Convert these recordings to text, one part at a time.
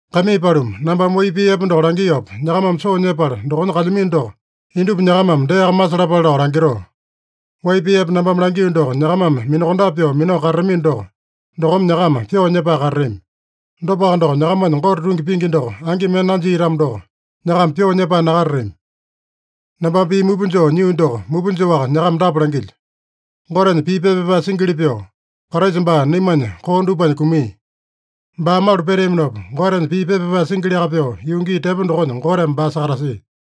Kaimii paluma, nambame wai pii epe doko langiopa nyakamame soo nyepala dokonya kalyamino doko, indupa nyakamame deaka masalapale lao langitoo. Wai pii epe nambame langio doko nyakamame minakondape pyoo minao katatamino doko, dokome nyakama pyoo nyepae katatami. Dopaka doko, nyakamanya Gote tungi pingi doko angi mende nanjia-tamo doko, nyakama pyoo nyepae nakatatami. Nambame pii mupa joo nyio doko mupa joaka nyakama dapa langilyo: Gotenya pii pepa pyapae singili pyoo, Kraisa baa naimanya koo dupanya kumia. Baa malu peteaminopa, Gotenya pii pepa pyapae singiliaka pyoo, yuu gii tepo dokonya Goteme baa sakatasia.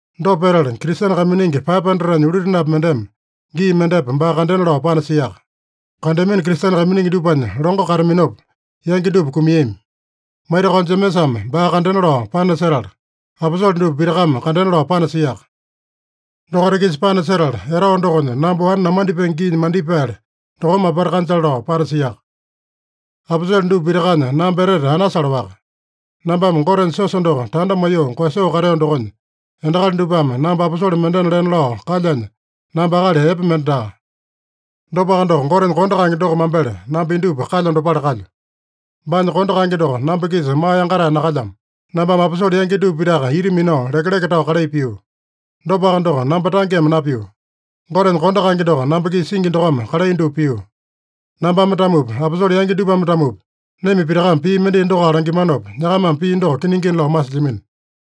Dopa petala, Kristene kaiminingi 500-nya ulutenapi mendeme gii mendepa baa kandena lao panasiaka. Kandeamino Kristene kaiminingi dupanya longo kataminopa, yangi dupa kumiami. Maitakao Jemesame baa kandena lao panasetala, aposole dupa pitakame kandena lao panasiaka. Dokaita-kisa panasetala, etao dokonya namba wane namandipenge giinya mandipaele dokome apata kanjale lao panasiaka. Aposole dupa pitakanya namba etete anasale-waka. Nambame Gotenya siosa doko tanda maiyoo koeyasoo kateo dokonya, endakali dupame namba aposole mendena lena lao kalyanya, namba akali epe mende daa. Dopaka doko, Gotenya kondo kaenge doko mambele namba indupa kalyo dopale kalyo. Baanya kondo kaenge doko namba-kisa maa yangatae nakalyamo. Nambame aposole yangi dupa pitaka ita minao lekeleke tao kalai pio. Dopaka doko, namba tangeme napio. Gotenya kondo kaenge doko namba-kisa singi dokome kalai dupa pio. Nambame-tamopi, aposole yangi dupame-tamopi, naima pitakame pii mendai dokoaka langimanopa, nyakamame pii doko kiningina lao masilyamino.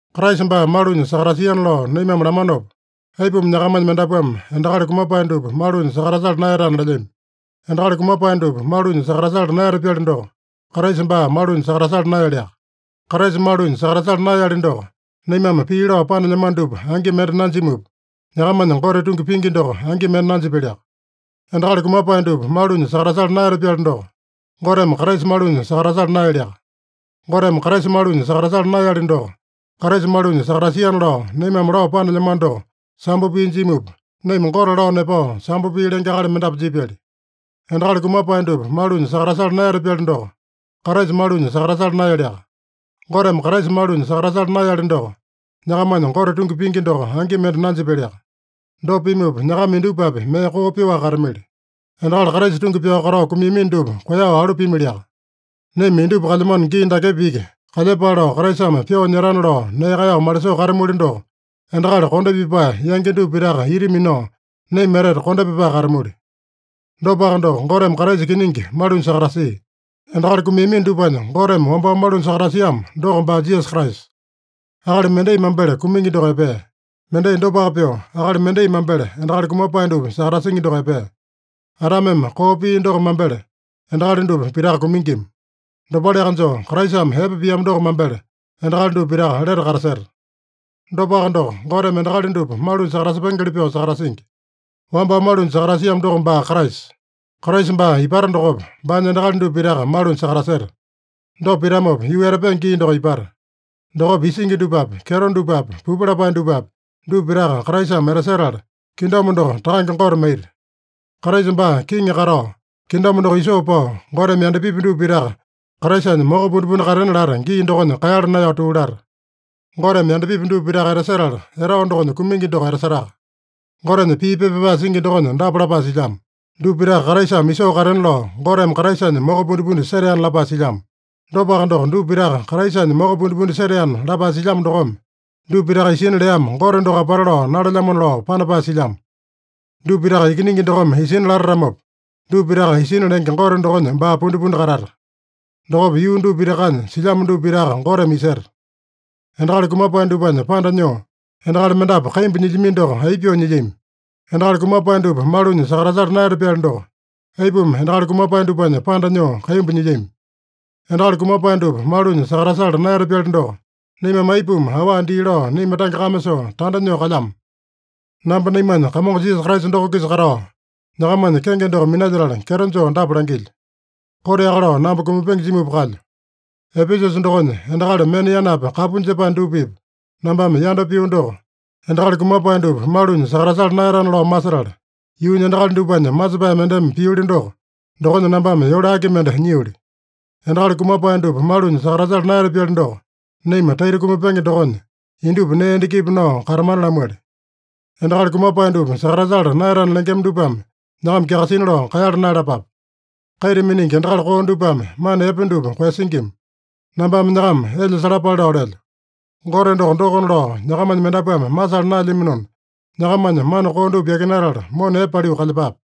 Kraisa baa malunya sakatasiana lao naimame lamanopa, aipuma nyakamanya mendapuame endakali kumapae dupa malunya sakatasala naeyatana lelyami? Endakali kumapae dupa malunya sakatasala naeyata-pyali doko, Kraisa baa malunya sakatasala naeyaliaka. Kraisa malunya sakatasala naeyali doko, naimame pii lao panelyamano dupa angi mende nanjimupa, nyakamanya Gote tungi pingi doko angi mende nanjipyaliaka. Endakali kumapae dupa malunya sakatasala naeyata-pyali doko, Goteme Kraisa malunya sakatasala naeyaliaka. Goteme Kraisa malunya sakatasala naeyali doko, Kraisa malunya sakatasiana lao naimame lao panelyamano doko sambo pii jimupa, naima Gote lao nepao sambo pii lenge akali mendapu jipyali. Endakali kumapae dupa malunya sakatasala naeyata-pyali doko, Kraisa malunya sakatasala naeyaliaka. Goteme Kraisa malunya sakatasala naeyali doko, nyakamanya Gote tungi pingi doko angi mende nanjipyaliaka. Dopa pimupa, nyakama indupapi mee koo pyoaka katamili. Endakali Kraisa tungi pyao katao kumiamino dupa koeyao alu piamiliaka. Naima indupa kalyamano gii dakepa iki kalyepale lao Kraisame pyoo nyetana lao nee kaeyao malisoo katamuli doko, endakali kondo pipae yangi dupa pitaka ita minao naima etete kondo pipae katamuli. Dopaka doko, Goteme Kraisa kiningi malunya sakatasia. Endakali kumiamino dupanya Goteme wambao malunya sakatasiamo doko baa Jisasa Kraisa. Akali mendai mambele kumingi doko epea. Mendai dopaka pyoo, akali mendai mambele endakali kumapae dupa sakatasingi doko epea. Adameme koo pia doko mambele endakali dupa pitaka kumingima. Dopaleaka joo, Kraisame epe piamo doko mambele endakali dupa pitaka lete kataseta. Dopaka doko, Goteme endakali dupa malunya sakatasepengeli pyoo sakatasingi. Wambao malunya sakatasiamo doko baa Kraisa. Kraisa baa ipata dokopa, baanya endakali dupa pitaka malunya sakataseta. Dopa pitamopa, yuu etapenge gii doko ipata. Dokopa isingi dupapi, kyeto dupapi, pupu lapae dupapi, dupa pitaka Kraisame etasetala, kingdom doko Takange Gote maita. Kraisa baa kiŋi katao, kingdom doko isoo pao, Goteme yandapipi dupa pitaka Kraisanya moko pundipundi katena lata gii dokonya kaeyala naeyao tuu lata. Goteme yandapipi dupa pitaka etasetala, etao dokonya kumingi doko etasetaka. Gotenya pii pepa pyapae singi dokonya dapa lapae silyamo: “Dupa pitaka Kraisame isoo katena lao Goteme Kraisanya moko pundipundi seteana” lapae silyamo. Dopaka doko, “Dupa pitaka Kraisanya moko pundipundi seteana” lapae silyamo dokome, dupa pitaka isina leamo Gote doko apata lao nalelyamona lao panapae silyamo. Dupa pitaka Ikiningi dokome isina latatamopa, dupa pitaka isina lenge Gote dokonya baa pundipundi katata. Dokopa yuu dupa pitakanya silyamo dupa pitaka Goteme iseta. Endakali kumapae dupanya panda nyoo, endakali mendapu kaimbu nyilyamino doko, aipa pyoo nyilyami? Endakali kumapae dupa malunya sakatasala naeyata-pyali doko, aipuma endakali kumapae dupanya panda nyoo kaimbu nyilyami? Endakali kumapae dupa malunya sakatasala naeyata-pyali doko, naimame aipuma awa dii lao naima tange kame soo tanda nyoo kalyama? Namba naimanya Kamongo Jisasa Kraisa doko-kisa katao, nyakamanya kenge doko minalyetala, kyeto joo dapa langilyo: Koteaka lao namba kumapenge jimupa kalyo. Epesusa dokonya endakali mena yanapi kapu jepae dupa-pipa nambame yanda pio doko, endakali kumapae dupa malunya sakatasala naeyatana lao masetala, yuunya endakali dupanya masepae mendeme pioli doko, dokonya nambame yole aki mende nyioli? Endakali kumapae dupa malunya sakatasala naeyata-pyali doko, naima taita kumapenge dokonya, indupa nee endakipa nao katamana lamuali. Endakali kumapae dupa sakatasala naeyatana lengema dupame nyakama kyakasina lao kaeyala naeyalapape. “Kaita miningi endakali koo dupame mana epe dupa koeyasingima.” Nambame nyakama elya salapale lao lelyo. Gote doko, dokona lao nyakamanya mendapuame masala naelyaminona, nyakamanya mana koo dupa yakinatala, mona epe paliu kalyepape.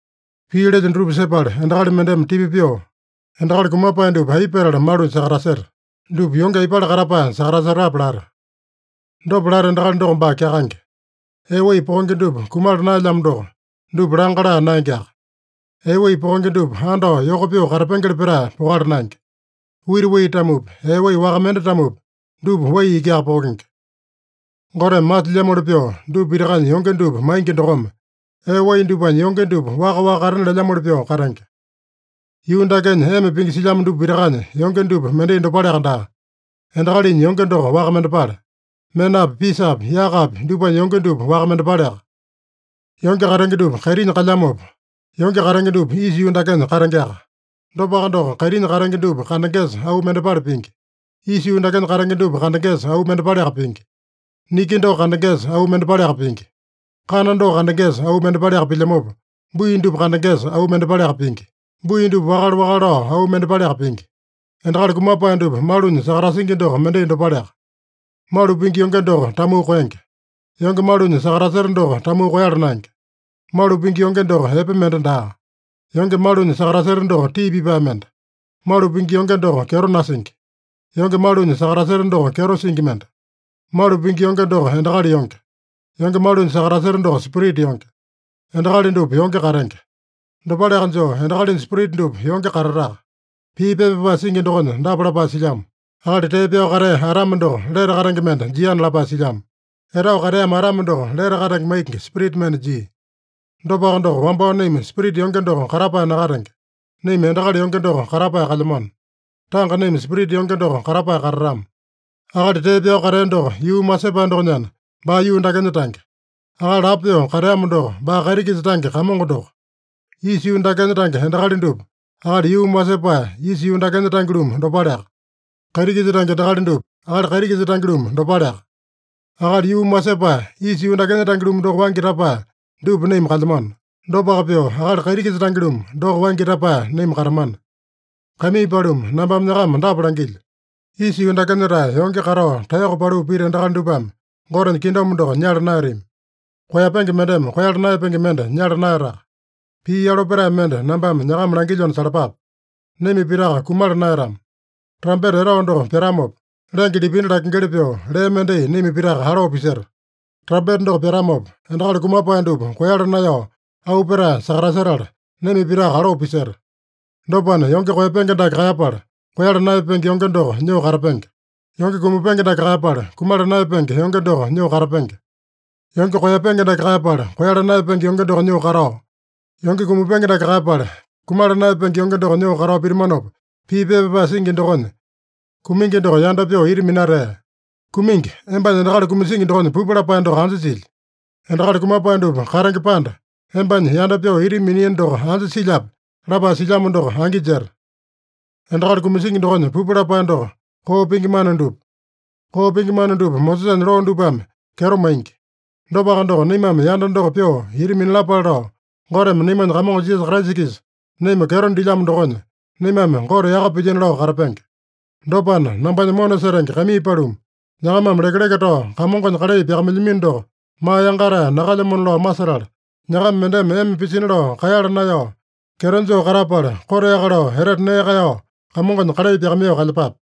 Pii lelyo dutupa sepala endakali mendeme tipa pyoo, “Endakali kumapae dupa aipa petala malunya sakataseta? Dupa yonge aipale katapae sakatasetape?” lata. Dopa lata endakali doko baa kyakaenge. Ee wai pokenge dupa kumala naelyamo doko, dupa langa laa naengeaka. Ee wai pokenge dupa andao yoko pyoo katapengeli petae pokala naenge. Wita wai-tamopi, ee wai waka mende-tamopi, dupa wai ikiaka pokenge. Goteme masilyamoli pyoo dupa pitakanya yonge dupa maingi dokome, ee wai dupanya yonge dupa waka-waka katena lelyamoli pyoo katenge. Yuu dakenya ema pingi silyamo dupa pitakanya yonge dupa mendai dopaleaka daa. Endakalinya yonge doko waka mendepale. Menapi, pisapi, yakapi dupanya yonge dupa waka mendepaleaka. Yonge katenge dupa kaitinya kalyamopa, yonge katenge dupa isa yuu dakenya katengeaka. Dopaka doko, kaitinya katenge dupa kandengesa auu mendepale pingi. Isa yuu dakenya katenge dupa kandengesa auu mendepaleaka pingi. Niki doko kandengesa auu mendepaleaka pingi. Kana doko kandengesa auu mendepaleaka pilyamopa, bui dupa kandengesa auu mendepaleaka pingi. Bui dupa wakale-wakale lao auu mendepaleaka pingi. Endakali kumapae dupa malunya sakatasingi doko mendai dopaleaka. Malu pingi yonge doko tamuu koenge. Yonge malunya sakataseta doko tamuu koeyala naenge. Malu pingi yonge doko epe mende daa. Yonge malunya sakataseta doko tii pipae mende. Malu pingi yonge doko kyeto nasingi. Yonge malunya sakataseta doko kyeto singi mende. Malu pingi yonge doko endakali yonge. Yonge malunya sakataseta doko spirita yonge. Endakali dupa yonge katenge. Dopaleaka joo, endakalinya spirita dupa yonge katataka. Pii pepa pyapae singi dokonya dapa lapae silyamo: “Akali tee pyao katea Adame doko lete katenge mende jiana” lapae silyamo. Etao kateamo Adame doko lete katenge maingi spirita mende jia. Dopaka doko, wambao naima spirita yonge doko katapae nakatenge. Naima endakali yonge doko katapae kalyamano. Tanga naima spirita yonge doko katapae katatama. Akali tee pyao katea doko yuumi wasepae dokonyana, baa yuu dakenya tange. Akali lapo pyoo kateamo doko, baa kaiti-kisa tange Kamongo doko. Isa yuu dakenya tange endakali dupa, akali yuumi wasepae, isa yuu dakenya tange-lumu dopaleaka. Kaiti-kisa tange endakali dupa, akali kaiti-kisa tange-lumu dopaleaka. Akali yuumi wasepae, isa yuu dakenya tange-lumu doko waingi tapae dupa naima kalyamano. Dopaka pyoo, akali kaiti-kisa tange-lumu doko waingi tapae naima katamana. Kaimii paluma, nambame nyakama dapa langilyo: Isa yuu dakenya-tae yonge katao taeyoko paliu pita endakali dupame Gotenya kingdom doko nyala naeyatami. Koeyapenge mendeme koeyala naeyapenge mende nyala naeyataka. Pii yalo petae mende nambame nyakama langilyona salapape: Naima pitaka kumala naeyatama. Trampeta etao doko pyatamopa, lenge lipindi lakengeli pyoo, lee mendai naima pitaka aloo piseta. Trampeta doko pyatamopa, endakali kumapae dupa koeyala naeyao auu petae sakatasetala, naima pitaka aloo piseta. Dopana, yonge koeyapenge dake kaeyapala, koeyala naeyapenge yonge doko nyoo katapenge. Yonge kumapenge dake kaeyapala, kumala naeyapenge yonge doko nyoo katapenge. Yonge koeyapenge dake kaeyapala, koeyala naeyapenge yonge doko nyoo katao, yonge kumapenge dake kaeyapala, kumala naeyapenge yonge doko nyoo katao pitamanopa, pii pepa pyapae singi dokonya, “Kumingi doko yanda pyoo ita minatea. Kumingi, embanya endakali kumasingi dokonya pupu lapae doko anja silya? Endakali kumapae dupa katenge panda, embanya yanda pyoo ita miniino doko anja silyape?” lapae silyamo doko angi jeta. Endakali kumasingi dokonya pupu lapae doko, koo pingi mana dupa. Koo pingi mana dupa Mosesanya loo dupame kyeto maingi. Dopaka doko, naimame yanda doko pyoo ita minalapale lao, Goteme naimanya Kamongo Jisasa Kraisa-kisa naima kyeto dilyamo dokonya, naimame Gote yaka pilyino lao katapenge. Dopana, nambanya mona setenge kaimii paluma, nyakamame lekeleke tao Kamongonya kalai pyakamailyamino doko maa yangatae nakalyamona lao masetala, nyakama mendeme ema pisina lao kaeyala naeyao, kyeto joo katapala, koteaka lao etete nee kaeyao Kamongonya kalai pyakamaiyoo kalyepape.